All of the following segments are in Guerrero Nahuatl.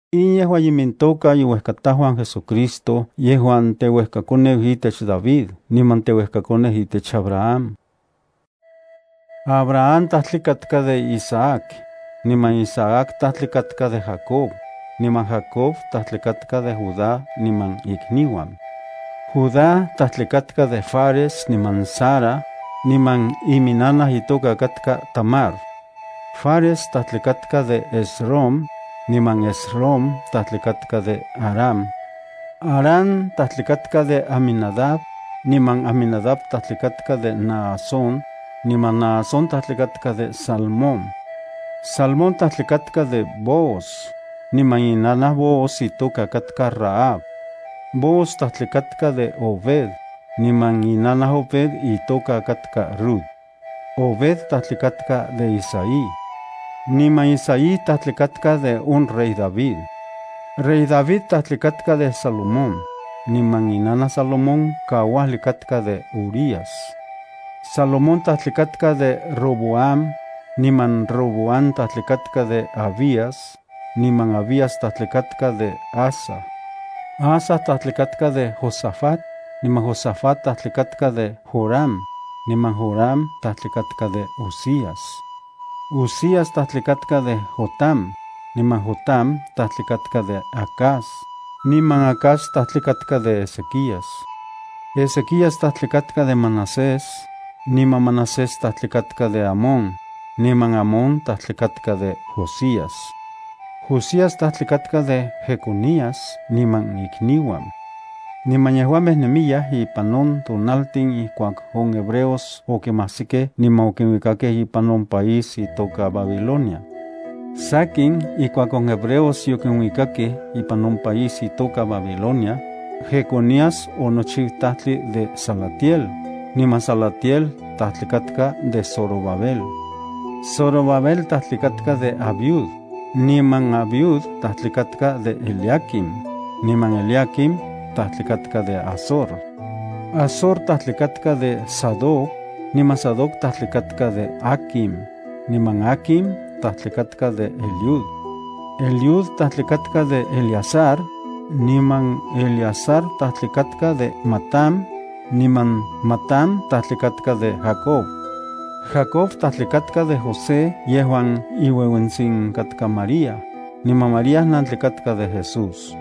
In yejua imintoka iuejkatajuan JesuCristo yejuan teuejkakoneu itech David niman teuejkakoneu itech Abraham. Abraham tajtli katka de Isaac, niman Isaac tajtli katka de Jacob, niman Jacob tajtli katka de Judá niman ikniuan. Judá tajtli katka de Fares niman Zara, niman iminnanaj itoka katka Tamar. Fares tajtli katka de Esrom, niman Esrom tajtli katka de Aram. Aram tajtli katka de Aminadab, niman Aminadab tajtli katka de Naasón, niman Naasón tajtli katka de Salmón. Salmón tajtli katka de Booz, niman inanaj Booz itoka katka Rahab. Booz tajtli katka de Obed, niman inanaj Obed itoka katka Rut. Obed tajtli katka de Isaí, niman Isaí tajtli katka de on rey David. Rey David tajtli katka de Salomón, niman inanaj Salomón kauajli katka de Urías. Salomón tajtli katka de Roboam, niman Roboam tajtli katka de Abías, niman Abías tajtli katka de Asa. Asa tajtli katka de Josafat, niman Josafat tajtli katka de Joram, niman Joram tajtli katka de Uzías. Uzías tajtli katka de Jotam, niman Jotam tajtli katka de Acaz, niman Acaz tajtli katka de Ezequías. Ezequías tajtli katka de Manasés, niman Manasés tajtli katka de Amón, niman Amón tajtli katka de Josías. Josías tajtli katka de Jeconías niman ikniuan. Niman yejuamej nemiyaj ipan on tonaltin ijkuak on hebreos okimajsikej niman okinuikakej ipan on país itoka Babilonia. Sakin, ijkuak on hebreos yokinuikakej ipan on país itoka Babilonia, Jeconías onochiu tajtli de Salatiel, niman Salatiel tajtli katka de Zorobabel. Zorobabel tajtli katka de Abiud, niman Abiud tajtli katka de Eliaquim, niman Eliaquim tajtli katka de Azor. Azor tajtli katka de Sadoc, niman Sadoc tajtli katka de Aquim, niman Aquim tajtli katka de Eliud. Eliud tajtli katka de Eleazar, niman Eleazar tajtli katka de Matán, niman Matán tajtli katka de Jacob. Jacob tajtli katka de José yejuan iueuentsin katka María, niman María nantli katka de Jesús.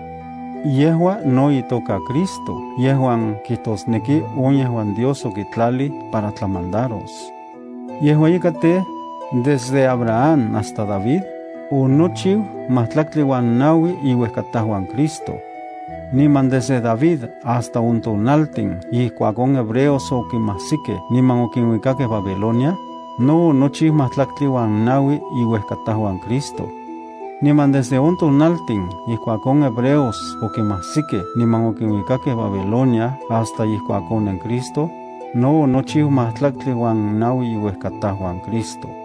Yejua no itoka Cristo yejuan kijtosneki on yejuan Dios okitlalij para tlamandaros. Yejua ika tej, Desde Abraham hasta David, onochiu majtlaktli uan naui iuejkatajuan Cristo. Niman desde David hasta on tonaltin ijkuak on hebreos okimajsikej niman okinuikakej Babilonia, no onochiu majtlaktli uan naui iuejkatajuan Cristo. Niman desde on tonaltin ijkuak on hebreos okimajsikej niman okinuikakej Babilonia hasta ijkuak onen Cristo, no onochiu majtlaktli uan naui iuejkatajuan Cristo.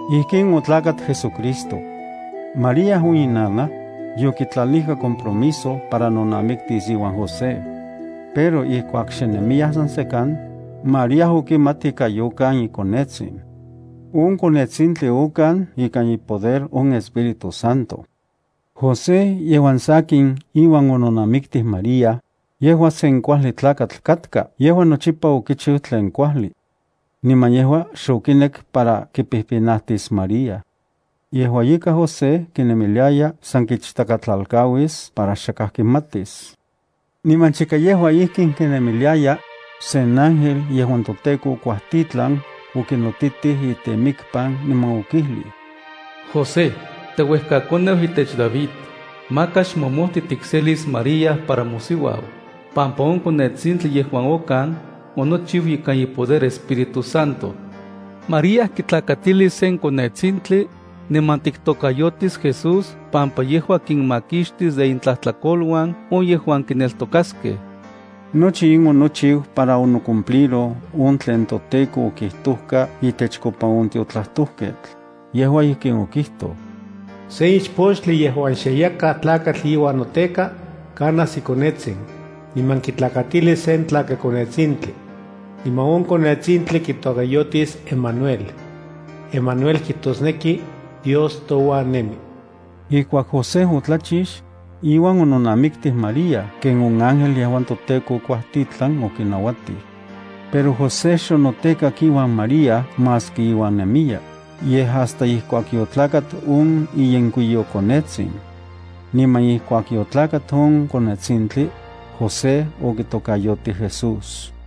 Ijkin otlakat JesuCristo. María, on inanaj, yokitlalijka compromiso para nonamiktis iuan José. Pero ijkuak xe nemiyaj san sekan, María okimat ika yokan ikonetsin. On konetsintli okan ikan ipoder on Espíritu Santo. José, yejuan sakin iuan ononamiktij María, yejua sen kuajli tlakatl katka. Yejua nochipa okichiu tlen kuajli. Niman yejua xokinek para kipijpinajtis María. Yejua ika José kinemiliaya san kichtakatlalkauis para xakaj kimatis. Niman chika yejua ijkin kinemiliaya, sen ángel yejuan toTEKO okuajtitlan okinotitij itemikpan niman okijlij: —José, teuejkakoneu itech David, maka xmomojti tikselis María para mosiuau, pampa on konetsintli, yejua okan onochiu ikan ipoder Espíritu Santo. María kitlakatilis sen konetsintli, niman tiktokayotis Jesús pampa yejua kinmakixtis de intlajtlakoluan on yejuan kineltokaskej. Nochi in onochiu para onocumpliroj on tlen toTEKO okijtojka itechkopa on tiotlajtojketl. Yejua ijkin okijtoj: Sen ichpochtli yejuan xe yakaj tlakatl iuan noteka, kanas ikonetsin, niman kitlakatilis sen tlakakonetsintli. Niman on konetsintli kitokayotis Emanuel. (Emanuel kijtosneki: Dios touan nemi.) Ijkuak José otlachix, iuan ononamiktij María ken on ángel yejuan toTEKO okuajtitlan okinauatij. Pero José xonotekak iuan María maski iuan nemiya, yej hasta ijkuak yotlakat on iyenkuiyokonetsin. Niman ijkuak yotlakat on konetsintli, José okitokayotij Jesús.